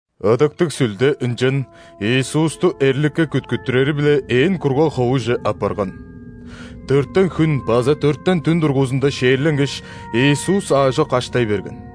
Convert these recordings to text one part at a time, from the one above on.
Ыдыктыг Сүлде ынчан Иисусту эрликке күткүттүрери-биле ээн кургаг ховуже аппарган. Дөртен хүн база дөртен дүн дургузунда ·шээрленгеш, Иисус аажок аштай берген.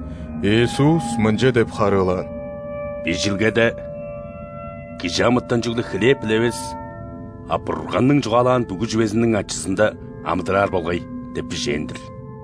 Иисус мынча деп харыылаан: «Бижилгеде: „Кижи амытан чүгле хлеб-биле эвес, а Бурганның чугаалаан бүгү чүвезиниң ачызында амыдыраар болгай“ – деп бижээн-дир».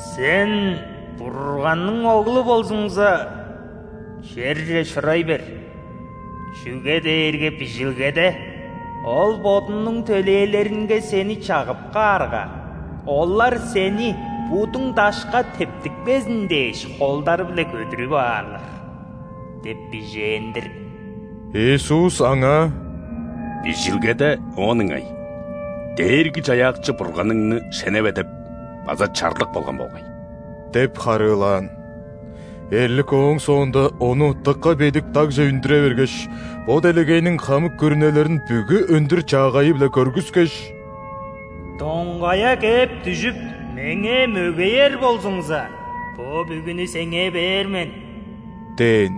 «Сен Бурганның Оглу болзуңза, черже шурай бер. Чүге дээрге Бижилгеде: „Ол Бодунуң төлээлеринге Сени чагып каарга, олар Сени, будуң дашка тептикпезин дээш, холдары-биле көдүрүп аарлар“ – деп бижээн-дир». Иисус аңаа: «Бижилгеде оон ыңай: „Дээрги-Чаяакчы Бурганыңны шеневе!“ – деп база чарлык болган болгай» – деп харыылаан. Эрлик ооң соонда Ону дыка бедик дагже үндүре бергеш, бо делегейниң хамык күрүнелерин бүгү өндүр-чаагайы-биле көргүскеш: «Доңгая кээп дүжүп, меңээ мөгеер болзуңза, бо бүгүнү Сеңээ бээр мен» – дээн.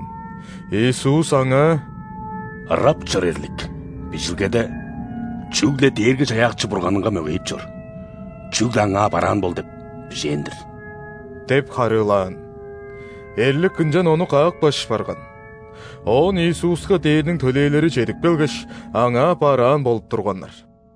Иисус аңаа: «Ырап чор, эрлик! Бижилгеде: „Чүгле Дээрги-Чаяакчы Бурганыңга мөгейип чор, чүгле Аңаа бараан бол“ – деп бижээн-дир» – деп харыылаан. Эрлик ынчан Ону каапкаш барган. Оон Иисуска ·дээрниң төлээлери чедип келгеш, Аңаа бараан болуп турганнар.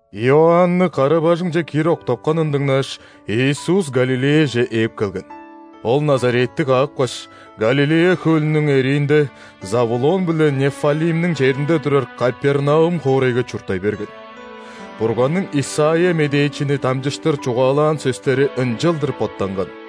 Иоанны кара-бажыңче киир октапканын дыңнааш, Иисус Галилеяже ээп келген. Ол Назаретти каапкаш, Галилея хөлүнүң эриинде, Завулон биле Неффалимниң черинде турар Капернаум хоорайга чурттай берген. Бурганның Исайя медээчини дамчыштыр чугаалаан сөстери ынчалдыр боттанган: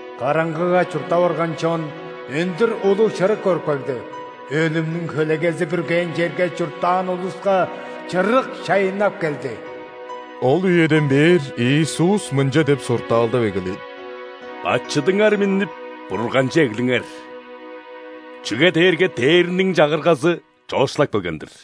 Караңгыга чурттап орган чон өндүр улуг чырык көрүп кагды,өлүмнүң хөлегези бүргээн черге чурттаан улуска чырык чайыннап келди». Ол үеден бээр Иисус мынча деп суртаалдап эгелээн: «Бачыдыңар миннип, Бурганче эглиңер! Чүге дээрге Дээрниң Чагыргазы чоокшулап келген-дир».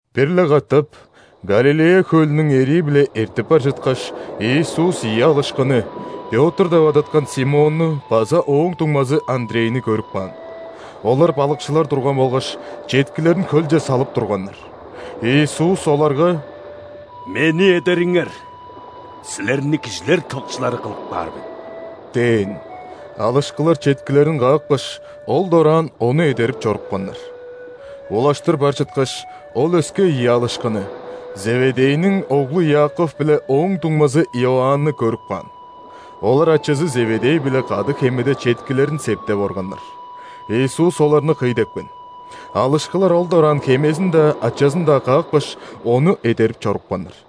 Бир-ле катап Галилея хөлүнүң эрии-биле эртип бар чыткаш, Иисус ийи алышкыны: Пётр деп адаткан Симонну база ооң дуңмазы Андрейни көрүп каан. Олар балыкчылар турган болгаш, четкилерин хөлче салып турганнар. Иисус оларга: «Мени эдериңер. Силерни кижилер тывыкчылары кылып каар мен» – дээн. Алышкылар четкилерин каапкаш, ол дораан Ону эдерип чорупканнар. Улаштыр бар чыткаш, Ол өске ийи алышкыны: Зеведейниң оглу Иаков биле ооң дуңмазы Иоанны көрүп каан. Олар ачазы Зеведей-биле кады хемеде четкилерин септеп органнар. Иисус оларны кый депкен. Алышкылар ол дораан хемезин-даа, ачазын-даа каапкаш, Ону эдерип чорупканнар.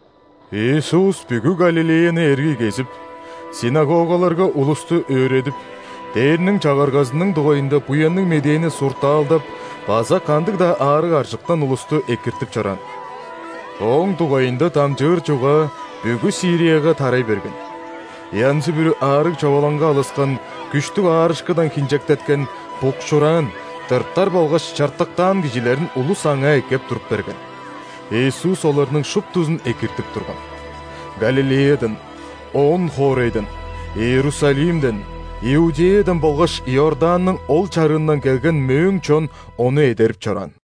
Иисус бүгү Галилеяны эргий кезип, ·синагогаларга улусту өөредип, Дээрниң Чагыргазының дугайында Буянныг Медээни суртаалдап база кандыг-даа аарыг-аржыктан улусту экиртип чораан. Ооң дугайында дамчыыр чугаа бүгү Сирияга тарай берген. Янзы-бүрү аарыг-човалаңга алыскан, күштүг аарышкыдан хинчектеткен, букшуураан, тыртар болгаш чартыктаан кижилерин улус Аңаа эккеп туруп берген. Иисус оларның шуптузун экиртип турган. Галилеядан, ·Он-хоорайдан, Иерусалимден, Иудеядан болгаш Иорданның ол чарыындан келген мөөң чон Ону эдерип чораан.